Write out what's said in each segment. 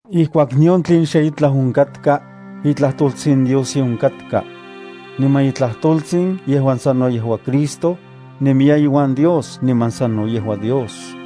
Ijkuak nion tlen xitlaj onkatka, iTlajtoltsin Dios ye onkatka. Niman iTlajtoltsin, yejuan sano yejua Cristo, nemiya iuan Dios niman sano yejua Dios.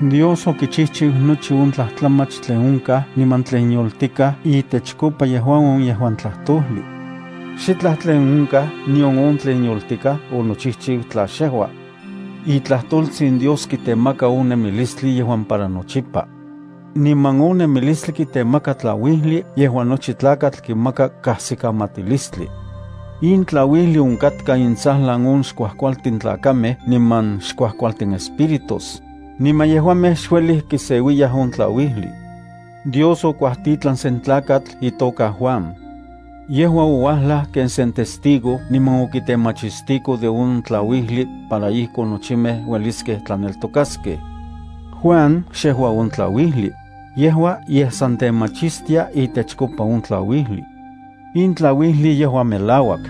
Dios okichijchiu nochi on tlajtlamach tlen onkaj niman tlen yoltikaj itechkopa yejua on yejuan Tlajtojli. Xitlaj tlen onkaj nion on tlen yoltikaj onochijchiu tla xyejua. ITlajtoltsin Dios kitemaka on nemilistli yejuan para nochipa. Niman on nemilistli kitemaka tlauijli yejuan nochi tlakatl kimaka kajsikamatilistli. In tlauijli onkatkaj intsajlan on xkuajkualtin tlakamej niman xkuajkualtin espíritus, niman yejuamej xuelij kiseuiya on tlauijli. Dios okuajtitlan sen tlakatl itoka Juan. Yejua ouajlaj ken sen testigo niman okitemachistiko de on tlauijli para ijkon nochimej ueliskej tlaneltokaskej. Juan xejua on tlauijli, yejua yej san temachistia itechkopa on tlauijli. In tlauijli yejua melauak,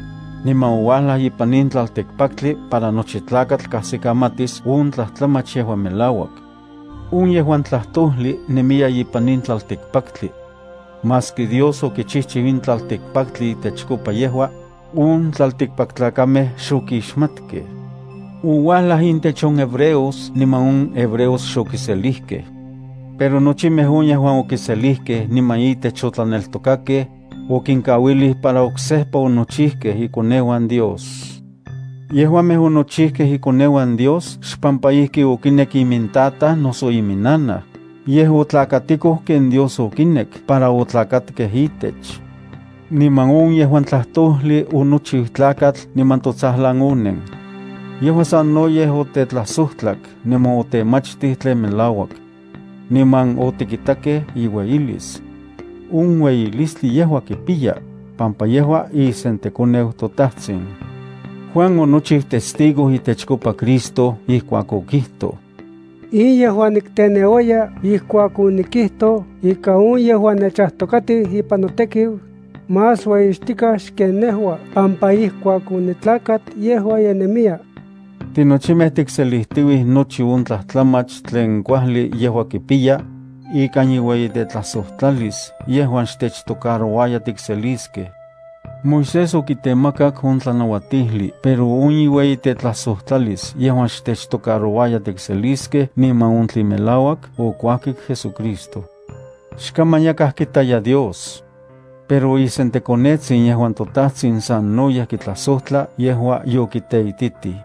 niman ouajlaj ipan in tlaltikpaktli para nochi tlakatl kajsikamatis on tlajtlamach yejuan melauak. On yejuan Tlajtojli nemiya ipan in tlaltikpaktli. Maski Dios okichijchiu in tlaltikpaktli itechkopa yejua, on tlaltikpaktlakamej xokixmatkej. Ouajlaj intech on hebreos niman on hebreos xokiselijkej. Pero nochimej on yejuan okiselijkej niman itech otlaneltokakej, okinkauilij para onochijkej ikoneuan Dios. Yejuamej onochijkej ikoneuan Dios xpampa ijki okinekkej imintataj noso iminnanaj, yej otlakatikoj ken Dios okinek para otlakatkej itech. Niman on yejuan Tlajtojli onochiu tlakatl niman totsajlan onen. Yejua sanoyej otetlajsojtlak niman otemachtij tlen melauak. Niman otikitakej iueyilis. On ueyilistli yejua kipiya, pampa yejua isenTekoneu toTajtsin. Juan onochiu testigo itechkopa Cristo ijkuak okijtoj: “In yejua nikteneuaya ijkuak onikijtoj ika on yejuan nechajtokatiu ipan notekiu, más ueyixtikaj xken nejua pampa ijkuak onitlakat yejua ye nemiya.” Tinochimej tikselijtiuij nochi on tlajtlamach tlen kuajli yejua kipiya ikan iueyitetlajsojtlalis yejuan xtechtocarouaya tikseliskej. Moisés okitemakak on tlanauatijli pero on iueyitetlajsojtlalis yejuan xtechtocarouaya tikseliskej niman on tlen melauak okuajkik JesuCristo. Xkaman yakaj kitaya Dios. Pero isenTekonetsin yejuan toTajtsin sanoyej kitlajsojtla yejua yokiteititij.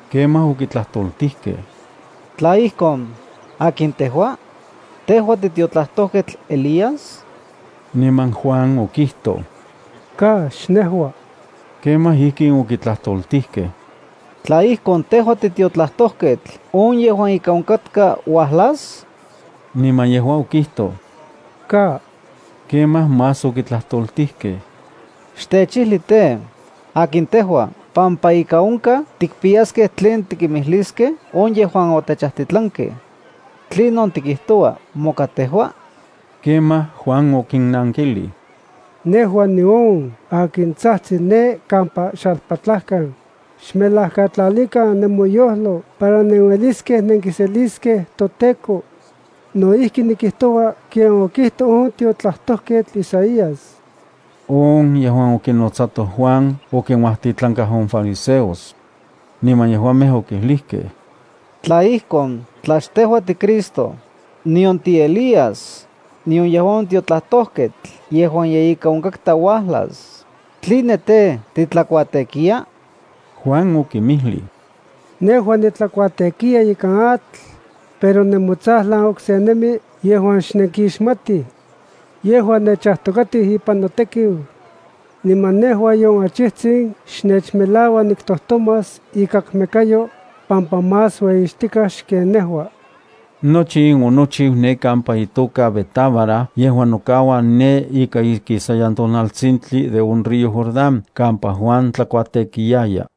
Kemaj okitlajtoltijkej: —Tla ijkon, ¿akin tejua? ¿Tejua titiotlajtojketl Elías? Niman Juan okijtoj: —Ka, xnejua. Kemaj ijkin okitlajtoltijkej: —Tla ijkon, ¿tejua titiotlajtojketl on yejuan ika onkatka uajlas? Niman yejua okijtoj: —Ka. Kemaj más okitlajtoltijkej: —Xtechijli tej, akin tejua pampa ika onkaj tikpiyaskej tlen tikimijliskej on yejuan otechajtitlankej. ¿Tlinon tikijtoua moka tejua? Ijkuakon Juan okinnankilij: —Nejua nión akin tsajtsi ne kampa xalpatlajkan: “Xmelajkatlalikan nemoyojlo para nenueliskej nenkiseliskej toTEKO.” No ijki nikijtoua ken okijtoj on tiotlajtojketl Isaías. On yejuan okinotsatoj Juan okinuajtitlankaj on fariseos. Niman yejuamej okijlijkej: —Tla ijkon, tla xtejua tiCristo, nion tiElías, nion yejua on tiotlajtojketl yejuan ika onkatka uajlas, ¿tline tej, titlakuatekiya? Juan okinmijlij: —Nejua nitlakuatekiya ikan atl, pero nemotsajlan okse nemi yejuan xnenkixmatij. Yejua nechajtokatiu ipan notekiu. Niman nejua nion achijtsin xnechmelaua niktojtomas ikakmekayo, pampa más ueyixtikaj xken nejua. Nochi in onochiu ne kampa itoka Betábara yejuan nokaua ne ika ikisayan tonaltsintli de on río Jordán kampa Juan tlakuatekiyaya.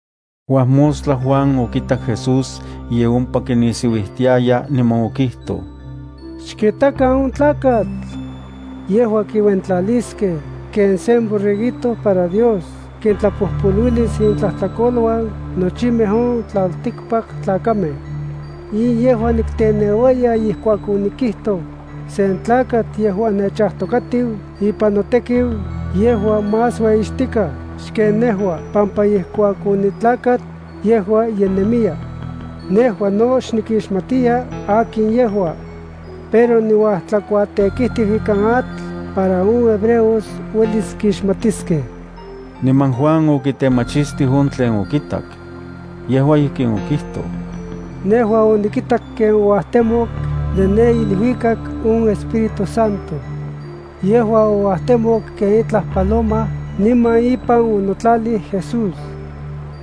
Uajmostla Juan okitak Jesús ye ompa kinisiuijtiaya niman okijtoj: —Xkitakan on tlakatl. Yejua kiuentlaliskej ken sen borreguito para Dios kintlapojpoluilis intlajtlakoluan nochimej on tlaltikpaktlakamej. In yejua nikteneuaya ijkuak onikijtoj: “Sen tlakatl yejuan nechajtokatiu ipan notekiu yejua más ueyixtikaj xken nejua pampa ijkuak onitlakat, yejua ye nemiya.” Nejua no xnikixmatiya akin yejua. Pero niuajtlakuatekijtiu ikan atl para on hebreos uelis kixmatiskej. Niman Juan okitemachistij on tlen okitak. Yejua ijkin okijtoj: —Nejua onikitak ken ouajtemok de ne iluikak on Espíritu Santo. Yejua ouajtemok ken itlaj paloma niman ipan onokau Jesús.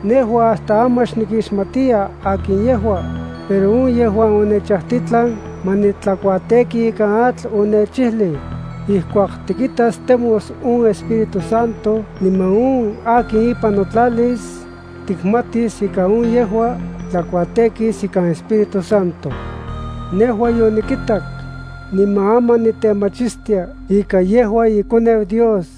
Nejua hasta aman xnikixmatiya akin yejua, pero on yejuan onechajtitlan ma nitlakuateki ikan atl onechijlij: “Ijkuak tikitas temos on Espíritu Santo niman on akin ipan nokauas, tikmatis ika on yejua tlakuatekis ikan Espíritu Santo.” Nejua yonikitak niman aman nitemachistia ika yejua iKoneu Dios.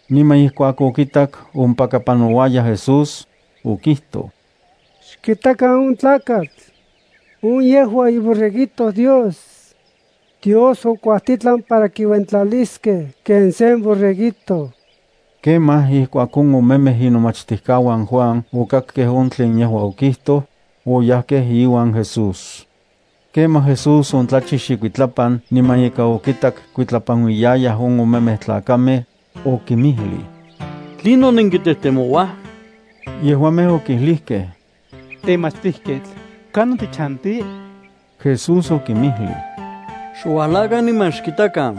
Niman ijkuak okitak ompaka panouaya Jesús, okijtoj: —Xkitakan on tlakatl. On yejua iborreguito Dios. Dios okuajtitlan para kiuentlaliskej ken sen borreguito. Kemaj ijkuak on omemej inomachtijkauan Juan okakkej on tlen yejua okijtoj, oyajkej iuan Jesús. Kemaj Jesús ontlachix ikuitlapan niman ika okitak kuitlapanuiyayaj on omemej tlakamej. Okimijlij: —¿Tlinon nenkitejtemouaj? Yejuamej okijlijkej: —Temachtijketl, ¿kanon tichanti? Jesús okinmijlij: —Xuajlakan niman xkitakan.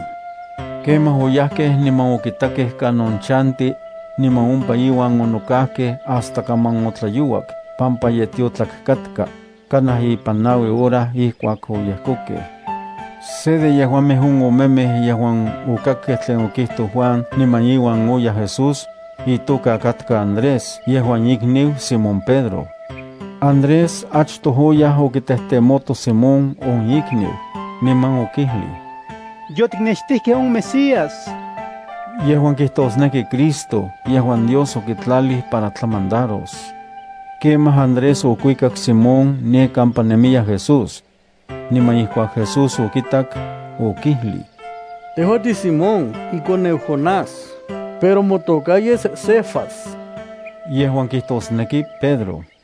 Kemaj oyajkej niman okitakej kanon chanti, niman ompa iuan onokajkej hasta kaman otlayouak pampa ye tiotlak katka, kanaj ipan naui hora ijkuak oyejkokej. Se de yejuamej on omemej yejuan okakkej tlen okijtoj Juan niman iuan oyaj Jesús, itoka katka Andrés yejuan ikniu Simón Pedro. Andrés achtoj oyaj okitejtemoto Simón on ikniu, niman okijlij: —Yotiknextijkej on Mesías —yejuan kijtosneki Cristo yejuan Dios okitlalij para tlamandaros. Kemaj Andrés okuikak Simón ne kampa nemiya Jesús. Niman ijkuak Jesús okitak, okijlij: —Tejua tiSimón ikoneu Jonás, pero motoka yes Cefas —yejuan kijtosneki Pedro.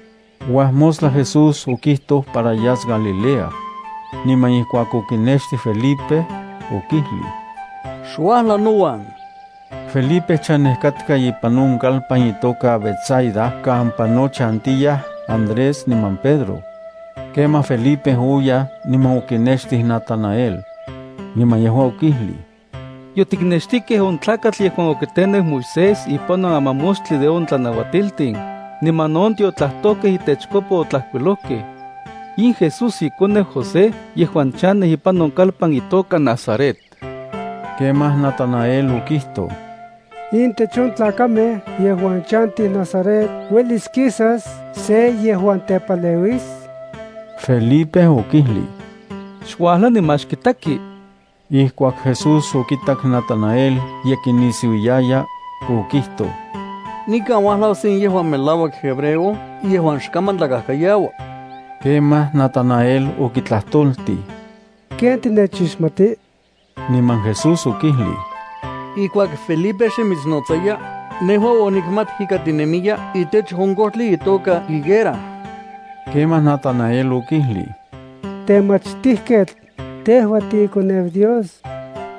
Uajmostla Jesús okitoj para yas Galilea. Niman ijkuak okinextij Felipe, okijlij: —Xuajla nouan. Felipe chanej katka ipan on kalpan itoka Betsaida kampa no chantiyaj Andrés niman Pedro. Kemaj Felipe oyaj niman okinextij Natanael. Niman yejua okijlij: —Yotiknextijkej on tlakatl yejuan okiteneu Moisés ipan on amamoxtli de on tlanauatiltin, niman no on tiotlajtojkej itechkopa otlajkuilojkej. In Jesús ikoneu José yejuan chanej ipan on kalpan itoka Nazaret. Kemaj Natanael okijtoj: —¿Intech on tlakamej yejuan chantij Nazaret uelis kisas se yejuan tepaleuis? Felipe okijlij: —Xuajla niman xkitaki. Ijkuak Jesús okitak Natanael ye kinisiuiaya, okijtoj: —Nikan uajlau se yejuan melauak hebreo yejuan xkaman tlakajkayaua. Kemaj Natanael okitlajtoltij: —¿Ken tinechixmati? Niman Jesús okijlij: —Ijkuak Felipe xe mitsnotsaya, nejua onikmat ika tinemiya tlatsintlan de on kojtli itoka higuera. Kemaj Natanael okijlij: —Temachtijketl, tejua tiiKoneu Dios.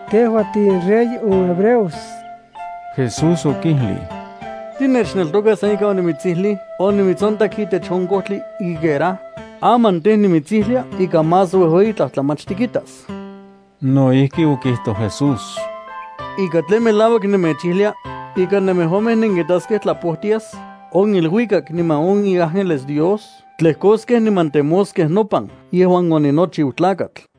Tejua tiinRey on hebreos. Jesús okijlij: —¿Tinechneltoka san ika onimitsijlij onimitsontak tlatsintlan de on kojtli higuera? Aman tej, nimitsijlia ika más uejueyi tlajtlamach tikitas. No ijki okijtoj Jesús: —Ika tlen melauak nemechijlia, ika nemejuamej nenkitaskej tlapojtias on iluikak niman on iángeles Dios tlejkoskej niman temoskej nopan yejuan oninochiu Tlakatl.